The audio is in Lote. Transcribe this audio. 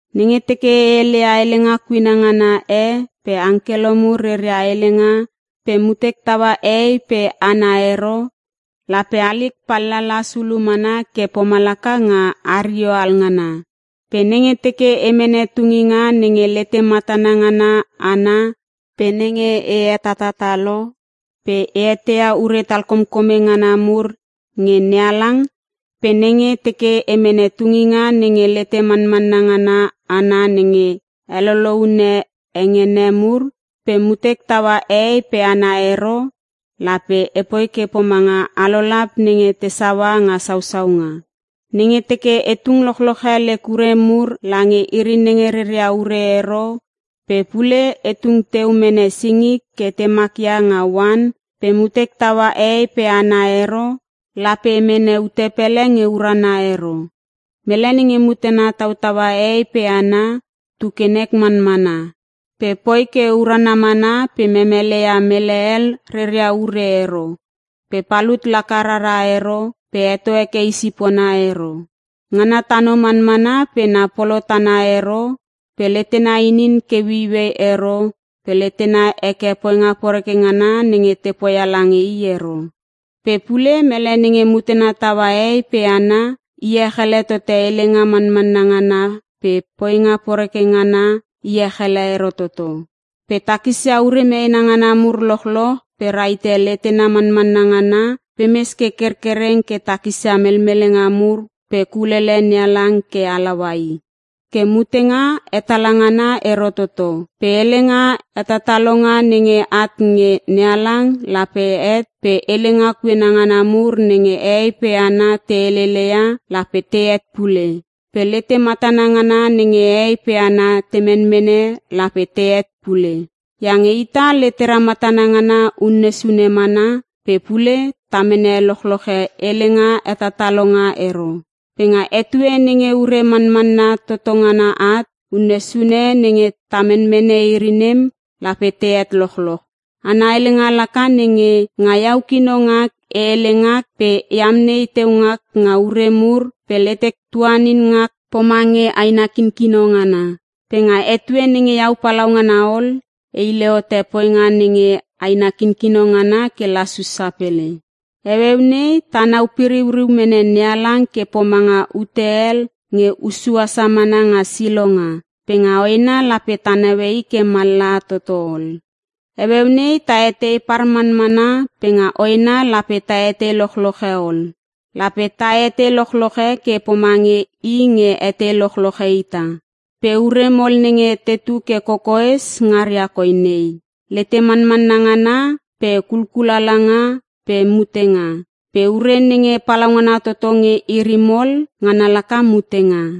Nenge teke e heleia helenga kuena ngana e pe angkelo mur reria helenga pe mutek taua hehei pe hana ero, lape halik palalas ulu mana ke pomalaka nga hario alngana. Pe nenge teke e mene tunginga nenge lete matana ngana ana pe nenge e hetatatalo pe e eteia ure talkomkome ngana mur nge NeHalang, pe nenge teke e mene tunginga nenge lete manmanna ngana ana nenge heloloune hengene mur pe mutek taua hehei pe hana ero, lape epoi ke pomanga alolap nenge te saua nga sausaunga. Nenge teke e tung lochloche lek ure mur lange iri nenge reria ure ero pe pule e tung teu mene singik ke te makia nga oan pe mutek taua hehei pe hana ero, lape e mene ute pele nge urana ero. Mele nenge mutena tautaua hehei pe hana, tu ke nek manmana pe poi ke urana mana pe memeleia mele hel reria ure ero pe palut laka rara ero pe heto heke i sipona ero. Ngana tano manmana pe na polo tana ero pe letena inin ke ueiuei ero pe letena heke poinga poreke ngana nenge te poia lange i ero. Pe pule mele nenge mutena taua hehei pe hana, iech ele tote helenga manmanna ngana pe poinga poreke ngana iech ele ero toto. Pe takisia ure meena ngana mur lochloch pe rahite letena manmanna ngana pe mes ke kerkereng ke takisia melmelenga mur pe kulele NeHalang ke halaua i. Ke mutenga hetala ngana ero toto. Pe helenga hetatalonga nenge at nge NeHalang lape het pe helenga kuena ngana mur nenge hehei pe hana te helele ia lape tehet pule pe lete matana ngana nenge hehei pe hana te menmene lape tehet pule. Iange ita letera matana ngana unne sune mana pe pule ta mene lochloche helenga hetatalonga ero. Pe nga etue nenge ure manmanna toto ngana at, unne sune nenge ta menmene iri nem lape tehet lochloch. Ana helenga laka nenge; Nga iau kino ngak e hele ngak pe e amnei teu ngak nga ure mur pe letek tuanin ngak pomange aina kinkino ngana. Pe nga etue nenge iau palaungana ol e hile hote poinga nenge aina kinkino ngana ke lasus sapele. Heueu nei tanau piriuriu mene NeHalang ke pomanga ute hel nge hussu asa mana nga silonga pe nga hoena lape ta naue i ke mallaha toto ol. Heueu nei ta etei par manmana pe nga hoena lape ta etei lochloche ol. Lape ta etei lochloche ke pomange I nge etei lochloche ita. Pe ure mol nenge tetu ke kokoes ngaria koi nei; lete manmanna ngana pe kukul alanga pe mutenga. Pe ure nenge palaungana toto nge iri mol, ngana laka mutenga.